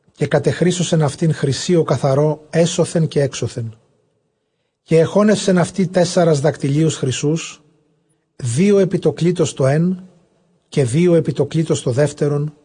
καὶ κατεχρύσωσεν αὐτὴν χρωσίῳ καθαρῷ ἔσωθεν καὶ ἔξωθεν· καὶ ἐχώνευσεν αὐτῇ τέσσαρας δακτυλίους χρυσοῦς· δύο ἐπὶ τὸ κλίτος τὸ ἓν, καὶ δύο ἐπὶ τὸ κλίτος τὸ δεύτερον,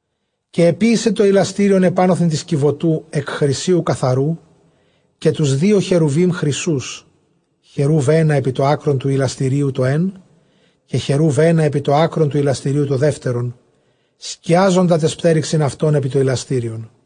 Καὶ ἐποίησε τὸ ἱλαστήριον ἐπάνωθεν τῆς κιβωτοῦ ἐκ χρυσίου καθαροῦ, καὶ τοὺς δύο χερουβεὶμ χρυσοῦς· χεροὺβ ἕνα ἐπὶ τὸ ἄκρον τοῦ ἱλαστηρίου τὸ ἓν, καὶ χεροὺβ ἕνα ἐπὶ τὸ ἄκρον τοῦ ἱλαστηρίου τὸ δεύτερον, σκιάζοντα ταῖς πτέρυξιν αὐτῶν ἐπὶ τὸ ἱλαστήριον.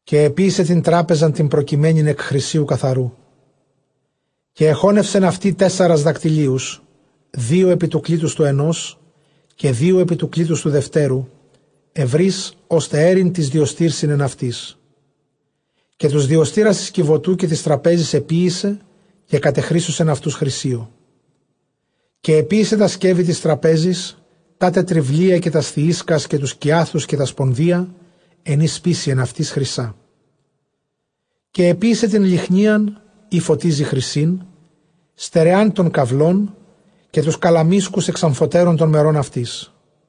Καὶ ἐποίησε τὴν τράπεζαν τὴν προκειμένην ἐκ χρυσίου καθαροῦ, καὶ ἐχώνευσεν αὐτῇ τέσσαρας δακτυλίους, δύο ἐπὶ τοῦ κλίτους τοῦ ἑνὸς, καὶ δύο ἐπὶ τοῦ κλίτους τοῦ δευτέρου, εὐρεῖς, ὥστε αἴρειν τοῖς διωστῆρσιν ἐν αὐτοῖς. Καὶ τοὺς διωστῆρας τῆς κιβωτοῦ καὶ τῆς τραπέζης ἐποίησε, καὶ κατεχρύσωσεν αὐτοὺς χρυσίῳ. Καὶ ἐποίησε τὰ σκεύη τῆς τραπέζης, τά τε τρυβλία, καὶ τὰς θυίσκας, καὶ τοὺς κυάθους, καὶ τὰ σπονδεῖα, ἐν οἷς σπείσει ἐν αὐτοῖς, χρυσᾶ. Καὶ ἐποίησε τὴν λυχνίαν ἣ φωτίζει, χρυσῆν, στερεὰν τὸν καυλόν, καὶ τοὺς καλαμίσκους ἐξ ἀμφοτέρων τῶν μερῶν αὐτῆς·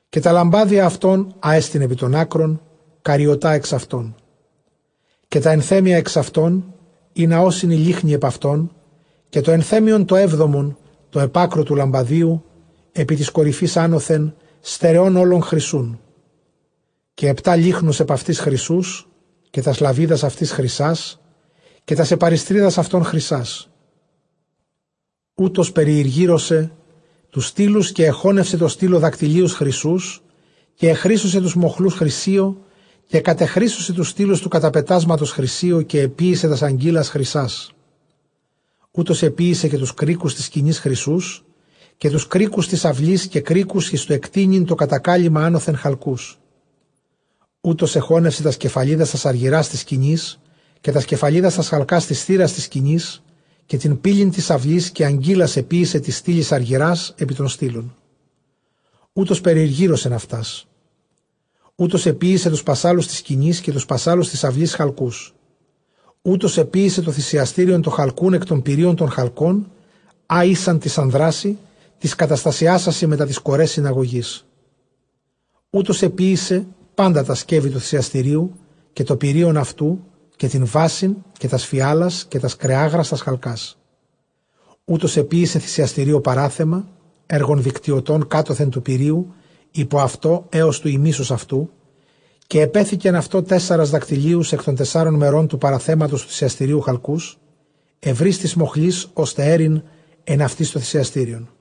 Καὶ τὰ λαμπάδια αὐτῶν, ἅ ἐστιν ἐπὶ τῶν ἄκρων, καρυωτὰ ἐξ αὐτῶν· καὶ τὰ ἐνθέμια ἐξ αὐτῶν, ἵνα ὦσιν οἱ λύχνοι ἐπʼ αὐτῶν· καὶ τὸ ἐνθέμιον τὸ ἕβδομον, τὸ ἐπʼ ἄκρου τοῦ λαμπαδίου, ἐπὶ τῆς κορυφῆς ἄνωθεν, στερεὸν ὅλον χρυσοῦν· Καὶ ἑπτὰ λύχνους ἐπʼ αὐτῆς χρυσοῦς, καὶ τὰς λαβίδας αὐτῆς χρυσᾶς, καὶ τὰς ἐπαρυστρίδας αὐτῶν χρυσᾶς. Οὗτος περιηργύρωσε τοὺς στύλους, καὶ ἐχώνευσε τῷ στύλῳ δακτυλίους χρυσοῦς, καὶ ἐχρύσωσε τοὺς μοχλοὺς χρυσίῳ, καὶ κατεχρύσωσε τοὺς στύλους τοῦ καταπετάσματος χρυσίῳ, καὶ ἐποίησε τὰς ἀγκύλας χρυσᾶς. Οὗτος ἐποίησε καὶ τοὺς κρίκους τῆς σκηνῆς χρυσοῦς, καὶ τοὺς κρίκους τῆς αὐλῆς, καὶ κρίκους εἰς τὸ ἐκτείνειν τὸ κατακάλυμμα ἄνωθεν χαλκοῦς· Οὗτος ἐχώνευσε τὰς κεφαλίδας τὰς ἀργυρᾶς τῆς σκηνῆς, καὶ τὰς κεφαλίδας τὰς χαλκᾶς τῆς θύρας τῆς σκηνῆς, καὶ τὴν πύλην τῆς αὐλῆς· καὶ ἀγκύλας ἐποίησε τοῖς στύλοις ἀργυρᾶς, ἐπὶ τῶν στύλων οὗτος περιηργύρωσεν αὐτάς· Οὗτος ἐποίησε τοὺς πασσάλους τῆς σκηνῆς, καὶ τοὺς πασσάλους τῆς αὐλῆς χαλκοῦς· Οὗτος ἐποίησε τὸ θυσιαστήριον τὸ χαλκοῦν ἐκ τῶν πυρείων τῶν χαλκῶν, ἃ ἦσαν τοῖς ἀνδράσιν τοῖς καταστασιάσασι μετὰ τῆς Κορὲ συναγωγῆς· Οὗτος ἐποίησε πάντα τὰ σκεύη τοῦ θυσιαστηρίου, καὶ τὸ πυρεῖον αὐτοῦ, καὶ τὴν βάσιν, καὶ τὰς φιάλας, καὶ τὰς κρεάγρας τὰς χαλκᾶς· Οὗτος ἐποίησε θυσιαστηρίῳ παράθεμα, ἔργον δικτυωτὸν κάτωθεν τοῦ πυρείου ὑπὸ αὐτὸ ἕως τοῦ ἡμίσους αὐτοῦ· καὶ ἐπέθηκεν αὐτῷ τέσσαρας δακτυλίους ἐκ τῶν τεσσάρων μερῶν τοῦ παραθέματος τοῦ θυσιαστηρίου χαλκοῦς, εὐρεῖς τοῖς μοχλοῖς, ὥστε αἴρειν ἐν αὐτοῖς τὸ θυσιαστήριον·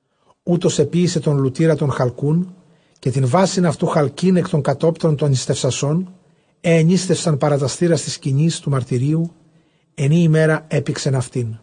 Οὗτος ἐποίησε τὸν λουτῆρα τὸν χαλκοῦν, καὶ τὴν βάσιν αὐτοῦ χαλκῆν ἐκ τῶν κατόπτρων τῶν νηστευσασῶν, αἳ ἐνήστευσαν παρὰ τὰς θύρας τῆς σκηνῆς τοῦ μαρτυρίου, ἐν ᾗ ἡμέρᾳ ἔπηξεν αὐτήν.